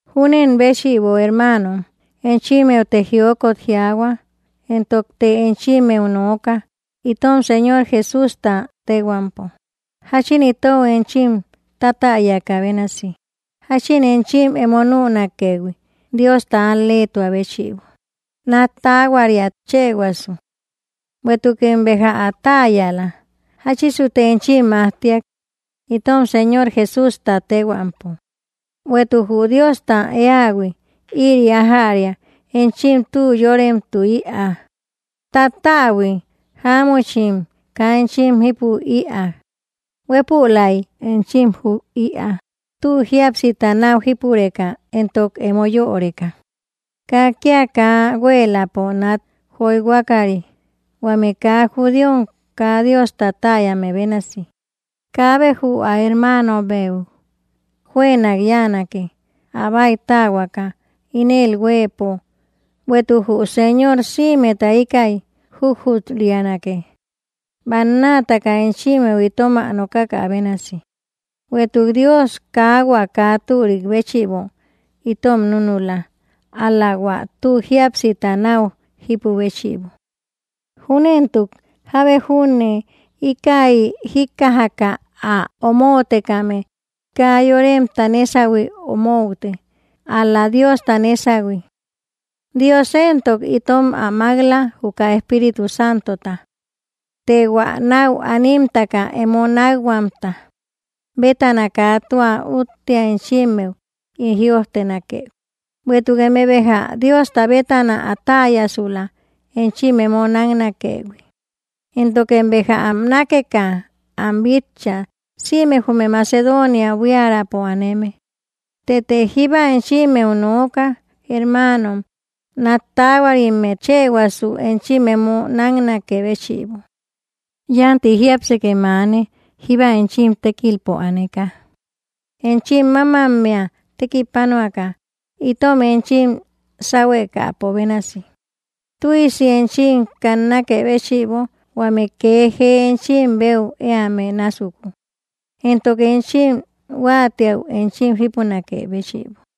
Júnen béchïbo, hermaanom, enchimmeute jiokot jiaahua, entokte enchimmeu nooka, itom Señor Jesústa téhuampo, jáchin itou enchim ä tátäyakä bénasi, jáchin enchim emo nünakëhui, Diosta al‑léetuä béchïbo, nat taahuariat chëhuasu. Bueïtukem béja ä täyala, jáchisute enchim majtiak, itom Señor Jesústa téhuampo; bueïtuk jü Diosta éähui ïri ájäria enchim tü yóremtü ïaa, tattäbui jáamuchim kaa enchim jípu ïaa, huëpulaim enchim jub ïaa, tü jíapsita nau jípureka éntok emo yöreka, kaa kía kaa huéeläpo nát joyhuakari, huame kaa judíom kaa Diosta täyame bénasi. Kaabe jü ä hermaanobeu juënak yáanake, ä báitähuaka, ínël huëpo, bueïtuk jü Señor sïmeta íkäi jujut-rianake, bannaataka enchimmeu itom ä nokakä bénasi. Bueïtuk Dios kaa hua kaa türik béchïbo itom núnula, ál‑la hua tü jíapsita náu jípu béchïbo. Júnentuk jábe junne íkäi jíkkajaka ä omoutekame kaa yoremta nésahui omoute, ál‑la Diosta nésahui. Dios éntok itom ä mák‑la, juka Espíritu Santota. Të hua náu animtaka emo nákhuamta bétana kaa tua úttea enchimmeu ín jïojtenakëhui, bueïtuk eme béja Diosta bétana ä täyasula, enchim emo náknakëhui. Éntokem béja am nákeka am bitcha, sïme jume Macedoonia buiärapo aneme. Tëte jíba enchimmeu nooka, hermaanom, nát taahuarimmet chëhuasu enchim emo náknakë béchïbo. Yánti jiápsekem aane, jíba enchim tékilpo aneka, enchim mámammea tekipanuaka, itom enchim sáhuekäpo bénasi, tüisi enchim kannakë béchïbo, huame kee jee enchim beu éame násuku, entok enchim huáatiäu enchim jípunakë béchïbo.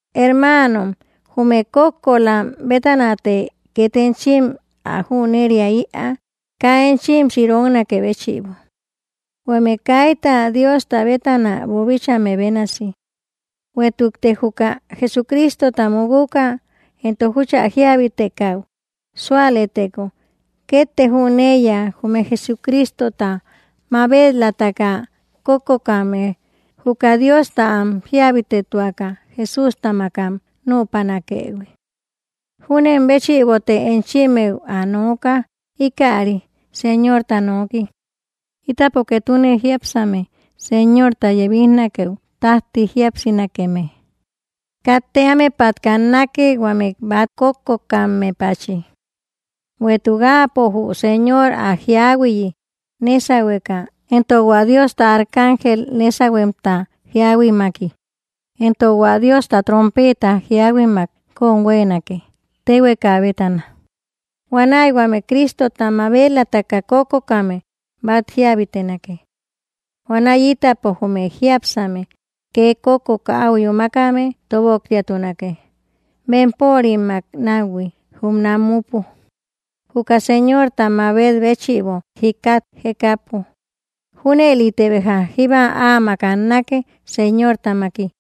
Hermaanom, jume kókkolam bétanate két enchim ä jüneria ïaa, kaa enchim siroknakë béchïbo, huame kaita Diosta bétana boobíchaïhuime bénasi. Bueïtukte juka Jesucristota mukuka entok júchä jíabitekäu súalëteko, kétte jüneiya jume Jesucristota mabel-lataka kókkokame juka Diosta am jíabitetuaka Jesústamak am nüpanakëhui. Júnen béchïbote enchimmeu ä nooka, íkäri Señorta nooki: Ítapo ketune jiápsame Señorta yebijnakeu tájti jíapsinakeme, katte ámepat kannake, huame bát kókkokammepachi. Bueïtuk Áapo jü Señor ä jíahuiayi nésahueka, entok hua Diosta arcángel nésahuemta jíahuimaki, entok hua Diosta trompeeta jíahuimak kóm huéenake, téhueka bétana. Huanäi huame Crístota mabel-lataka kókkokame bát jíabitenake. Huanäi ítapo jume jiápsame, kee kókkoka áu yúmakame, tóboktiatunake, bempörimmak náuhui jume namupo, juka Señorta mabet béchïbo, jikat jekapo. Júnëlite béja jíba áamak annake Señortamaki.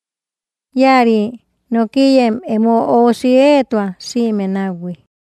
Íäri nokiyem emo óusi éetua, sïme náuhui.